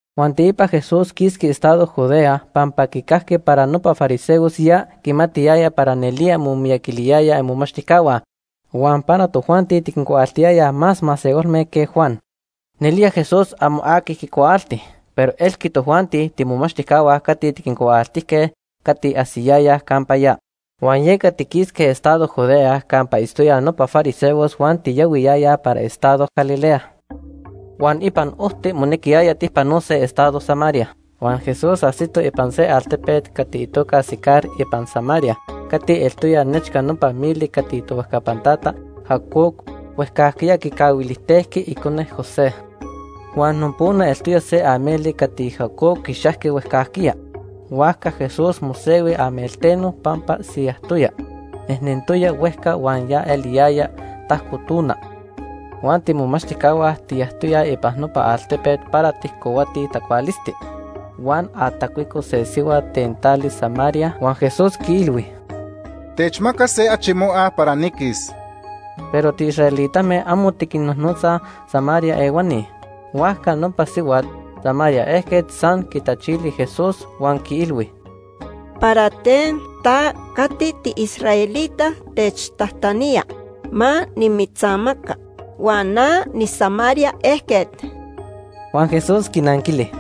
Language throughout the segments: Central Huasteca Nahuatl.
Huan teipa Jesús quisqui estado Judea pampa quicajqui para nopa fariseos ya quimatiyayaj para nelía momiyaquiliyayaj imomachtijcahua huan para tojuanti tiquincuaaltiyayaj más masehualme que Juan. Nelía Jesús amo aqui quicuaalti, pero elque tojuanti tiimomachtijcahua cati tiquincuaaltijque cati ajsiyayaj campa ya. Huan yeca tiquisque estado Judea campa itztoyaj nopa fariseos huan tiyahuiyayaj para estado Galilea. Huan ipan ojti monequiyaya tijpanose estado Samaria. Huan Jesús ajsito ipan se altepet cati itoca Sicar ipan Samaria cati eltoya nechca nopa mili cati tohuejcapan tata Jacob huejcajquiya quicahuilijtejqui icone, José. Huan nopona eltoya se ameli cati Jacob quixajqui huejcajquiya. Huajca Jesús mosehui amelteno pampa siyajtoya. Nejnentoya huejca huan ya eliyaya tajco tona. Huan tiimomachtijcahua tiyajtoyaj ipan nopa altepet para tijcohuatij tacualisti. Huan atacuico se sihuat ten tali Samaria, huan Jesús quiilhui: ―Techmaca se achi moa para niquis. Pero tiisraelitame amo tiquinnojnotzaj Samaria ehuani. Huajca nopa sihuat Samaria ejquet san quitachili Jesús huan quiilhui: ―¿Para ten ta cati tiisraelita techtajtanía ma nimitzamaca huan na niSamaria ejquet? Huan Jesús quinanquili: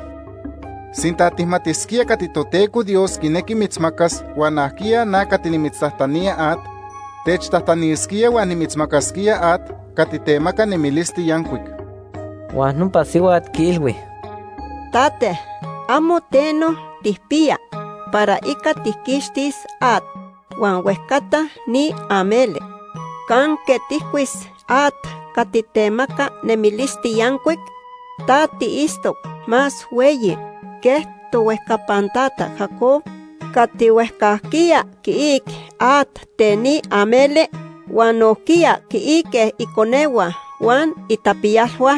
―Sinta tijmatisquía cati Toteco Dios quinequi mitzmacas huan ajquiya na cati nimitztajtanía at, techtajtanisquía huan nimitzmacasquía at cati temaca nemilisti yancuic. Huan nopa sihuat quiilhui: ―Tate, amo teno tijpiya para ica tijquixtis at huan huejcata ni ameli. ¿Canque tijcuis at cati temaca nemilisti yancuic? ¿Ta tiitztoc más hueyi que tohuejcapan tata Jacob cati huejcajquiya quiic at ten ni ameli huan nojquiya quiique iconehua huan itapiyalhua,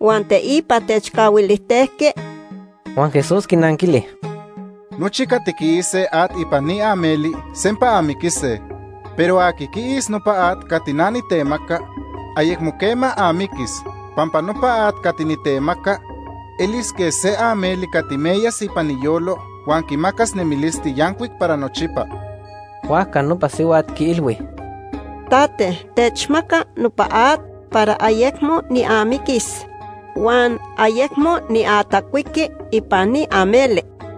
huan teipa techcahuilijtejqui? Huan Jesús quinanquili: ―Nochi cati quiise at ipan ni ameli sempa amiquise. Pero aqui quiis nopa at cati na nitemaca, ayecmo quema amiquis pampa nopa at cati nitemaca elis quej se ameli cati meyas ipan iyolo huan quimacas nemilisti yancuic para nochipa. Huajca nopa sihuat quiilhui: ―Tate, techmaca nopa at para ayecmo niamiquis huan ayecmo niatacuiqui ipan ni ameli.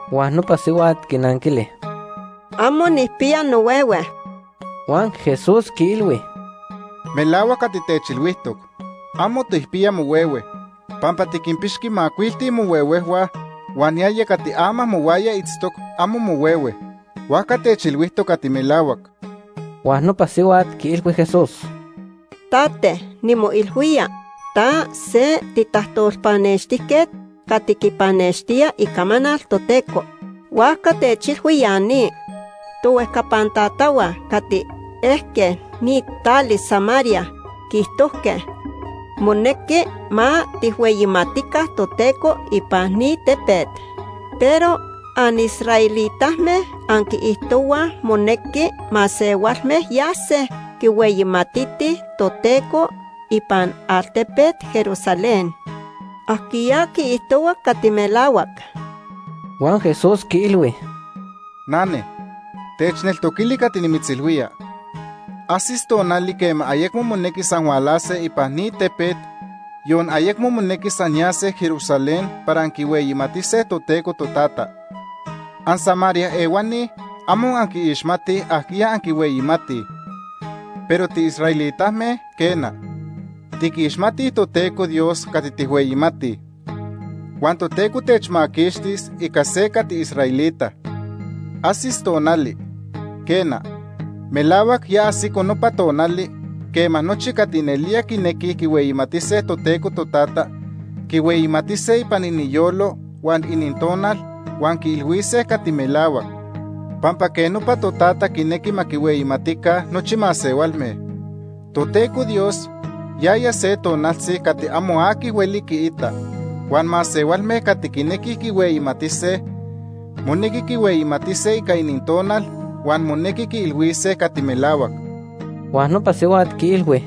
Huan nopa sihuat quinanquili: ―Amo nijpiya nohuehue. Huan Jesús quiilhui: ―Melahuac cati techilhuijtoc, amo tijpiya mohuehue. Pampa tiquinpixqui macuilti mohuehuejhua huan yaya cati ama mohuaya itztoc, amo mohuehue. Huajca techilhuijtoc cati melahuac. Huan nopa sihuat quiilhui Jesús: ―Tate, nimoilhuía ta se titajtolpanextijquet cati quipanextía icamanal Toteco. Huajca techilhui ya ni. Tohuejcapan tatahua cati ejque ni tali Samaria quiijtojque monequi ma tijhueyimatica Toteco ipan ni tepet, pero anisraelitame anquiijtohuaj monequi masehualme yase quihueyimatitij Toteco ipan altepet Jerusalén. ¿Ajquiya quiijtohua cati melahuac? Huan Jesús quiilhui: ―Nane, techneltoquili cati nimitzilhuía. Ajsis tonali quema ayecmo monequis anhualase ipan ni tepet, yon ayecmo monequis anyase Jerusalén para anquihueyimatise Toteco Totata. AnSamaria ehuani amo anquiixmatij ajquiya anquihueyimatij. Pero tiisraelitame, quena, tiquixmatij Toteco Dios cati tijhueyimatij. Huan Toteco temaquixtis ica se cati israelita. Ajsis tonali, quena, melahuac ya ajsico nopa tonali, quema nochi cati nelía quinequij quihueyimatise Toteco Totata quihueyimatise ipan iniyolo huan inintonal huan quiilhuise cati melahuac, pampa quej nopa Totata quinequi ma quihueyimatica nochi masehualme. Toteco Dios yaya se tonaltzi cati amo aqui hueli quiita, huan masehualme cati quinequij quihueyimatise monequi quihueyimatise ica inintonal huan monequi quiilhuise cati melahuac. Huan nopa sihuat quiilhui: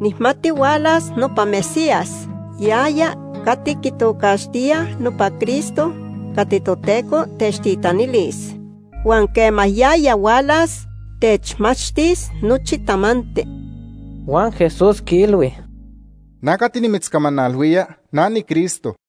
―Nijmati hualas nopa Mesías, yaya cati quitocaxtíaj nopa Cristo cati Toteco techtitanilis. Huan quema yaya hualas, techmachtis nochi tamanti. Huan Jesús quiilhui: ―Na cati nimitzcamanalhuía, na niCristo.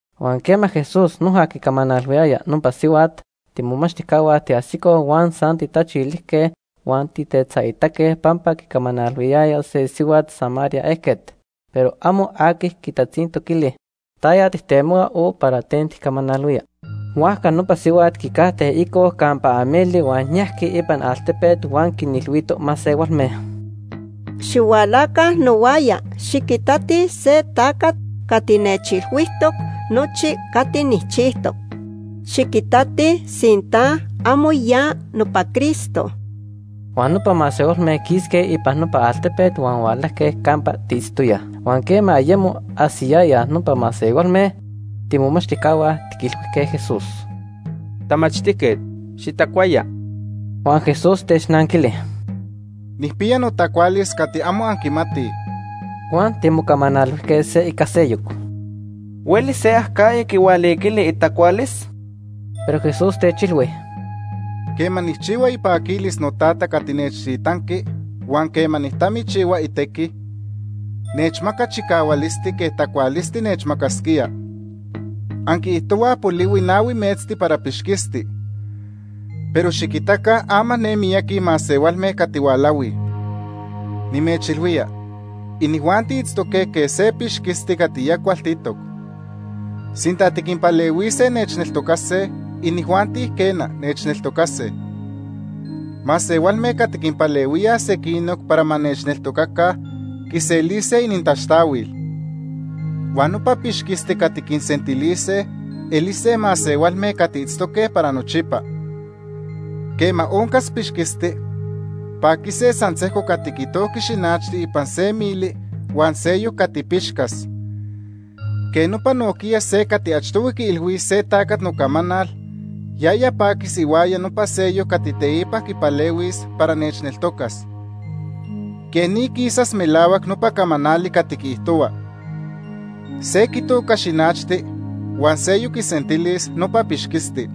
Huan quema Jesús noja quicamanalhuiyaya nopa sihuat, tiimomachtijcahua tiajsicoj huan san tijtachilijque huan tijtetzaitaque pampa quicamanalhuiyaya se sihuat Samaria ejquet, pero amo aqui quitatzintoquili: “¿Taya tijtemohua?” o “¿Para ten tijcamanalhuía?” Huajca nopa sihuat quicajte ico campa ameli huan yajqui ipan altepet huan quinilhuito masehualme: ―Xihualaca nohuaya, xiquitatij se tacat cati nechilhuijtoc nochi cati nijchijtoc. Xiquitatij sinta amo ya nopa Cristo. Huan nopa masehualme quisque ipan nopa altepet huan hualajque campa tiitztoyaj. Huan quema ayemo ajsiyayaj nopa masehualme, tiimomachtijcahua tiquilhuijque Jesús: ―Tamachtijquet, xitacuaya. Huan Jesús technanquili: ―Nijpiya notacualis cati amo anquimatij. Huan timocamanalhuijque se ica seyoc: ―¿Huelis se acajya quihualiquili itacualis? Pero Jesús techilhui: ―Quema nijchihua ipaquilis noTata cati nechtitanqui huan quema nijtamichihua itequi, nechmaca chicahualisti quej tacualisti nechmacasquía. Anquiijtohuaj polihui nahui metzti para pixquisti. Pero xiquitaca ama ne miyaqui masehualme cati hualahuij. Nimechilhuía, inijuanti itztoque quej se pixquisti cati ya cualtitoc. Sinta tiquinpalehuise nechneltocase, inijuanti quena, nechneltocase. Masehualme cati quinpalehuíaj sequinoc para ma nechneltocaca quiselise inintaxtahuil. Huan nopa pixquisti cati quinsentilise elise masehualme cati itztose para nochipa. Quema oncas pixquisti, paquise san sejco cati quitojqui xinachti ipan se mili huan seyoc cati quipixcas. Quej nopa nojquiya se cati achtohui quiilhuis se tacat nocamanal, yaya paquis ihuaya nopa seyoc cati teipa quipalehuis para nechneltocas. Quej ni quisas melahuac nopa camanali cati quiijtohua: ‘Se quitoca xinachti huan seyoc quisentilis nopa pixquisti.’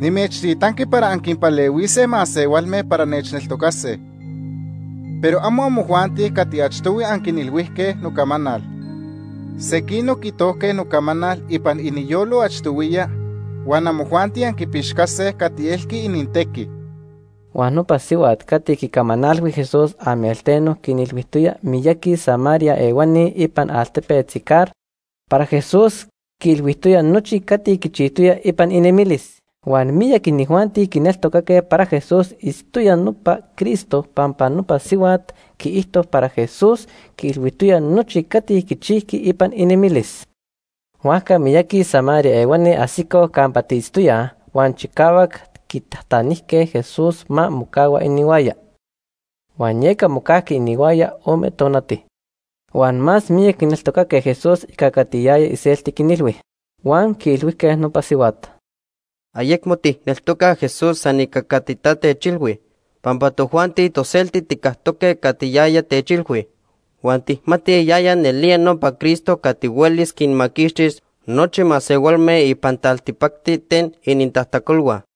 Nimechtitanqui para anquinpalehuise masehualme para nechneltocase. Pero amo amojuanti cati achtohui anquinilhuijque nocamanal. Sequinoc quitojque nocamanal ipan iniyolo achtohuiya huan amojuanti anquipixcase cati elqui inintequi. Huan nopa sihuat cati quicamanalhui Jesús amelteno quinilhuijtoya miyaqui Samaria ehuani ipan altepet Sicar para Jesús quiilhuijtoya nochi cati quichijtoya ipan inemilis. Huan miyac inijuanti quineltocaque para Jesús itztoya nopa Cristo pampa nopa sihuat quiijto para Jesús quiilhuijtoya nochi cati quichijqui ipan inemilis. Huajca miyaqui Samaria ehuani ajsicoj campa tiitztoyaj huan chicahuac quitajtanijque Jesús ma mocahua inihuaya, huan yeca mocajqui inihuaya ome tonati. Huan más miyac quineltocaque Jesús ica cati yaya iselti quinilhui. Huan quiilhuijque nopa sihuat: ―Ayecmo tijneltocaj Jesús san ica cati ta techilhui, pampa tojuanti toselti tijcactoque cati yaya techilhui, huan tijmatij yaya nelía nopa Cristo cati huelis quinmaquixtis nochi masehualme ipan taltipacti ten inintajtacolhua.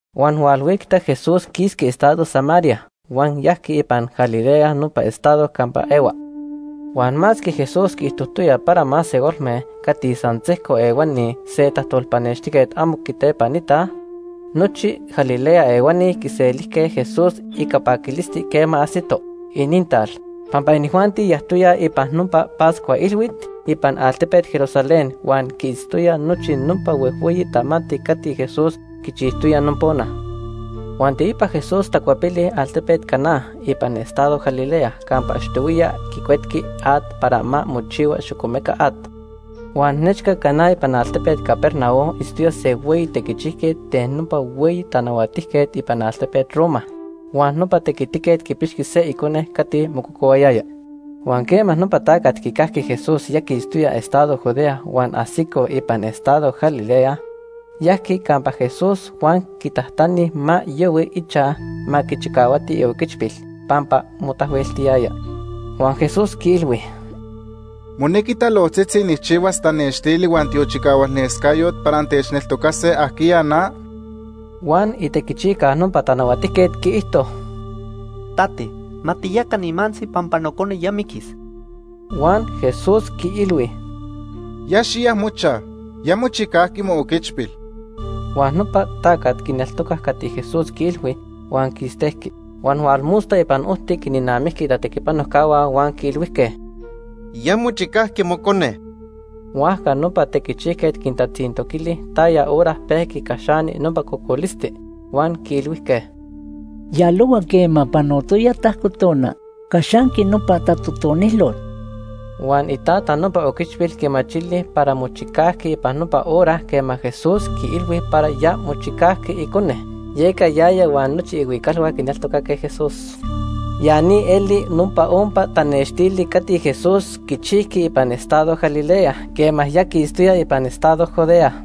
Huan hualhuicta Jesús quisqui estado Samaria huan yajqui ipan Galilea nopa estado campa ehua. Huan masque Jesús quiijtojtoya para masehualme cati san sejco ehuani se tajtolpanextijquet amo quitepanitaj, nochi Galilea ehuani quiselijque Jesús ica paquilisti quema ajsito inintal, pampa inijuanti yajtoyaj ipan nopa Pascua Ilhuit ipan altepet Jerusalén huan quiitztoyaj nochi nopa huejhueyi tamanti cati Jesús quichijtoya nopona. Huan teipa Jesús tacuepili altepet Caná ipan estado Galilea campa achtohuiya quicuetqui at para ma mochihua xocomeca at. Huan nechca Caná ipan altepet Capernaum itztoya se hueyi tequichijquet ten nopa hueyi tanahuatijquet ipan altepet Roma. Huan nopa tequitiquet quipixqui se icone cati mococohuayaya. Huan quema nopa tacat quicajqui Jesús ya quistoya estado Judea huan ajsico ipan estado Galilea, yajqui campa Jesús huan quitajtani ma yahui ichaj ma quichicahuati ioquichpil pampa motahueltiyaya. Huan Jesús quiilhui: ―¿Monequi talojtzitzi nijchihuas tanextili huan tiochicahualnescayot para antechneltocase ajquiya na? Huan itequichijca nopa tanahuatijquet quiijto: ―Tate, ma tiyaca nimantzi pampa nocone ya miquis. Huan Jesús quiilhui: ―Ya xiya mochaj. Ya mochicajqui mooquichpil. Huan nopa tacat quineltocac cati Jesús quiilhui huan quistejqui. Huan hualmosta ipan ojti quinnamijqui itatequipanojcahua huan quiilhuijque: ―Ya mochicajqui mocone. Huajca nopa tequichijquet quintatzintoquili taya hora pejqui caxani nopa cocolisti, huan quiilhuijque: ―Yalohua quema panotoya tajco tona caxanqui nopa tatotonilot. Huan itata nopa oquichpil quimachili para mochicajqui ipan nopa hora quema Jesús quiilhui para ya mochicajqui icone. Yeca yaya huan nochi ihuicalhua quineltocaque Jesús. Ya ni eli nopa ompa tanextili cati Jesús quichijqui ipan estado Galilea quema ya quistoya ipan estado Judea.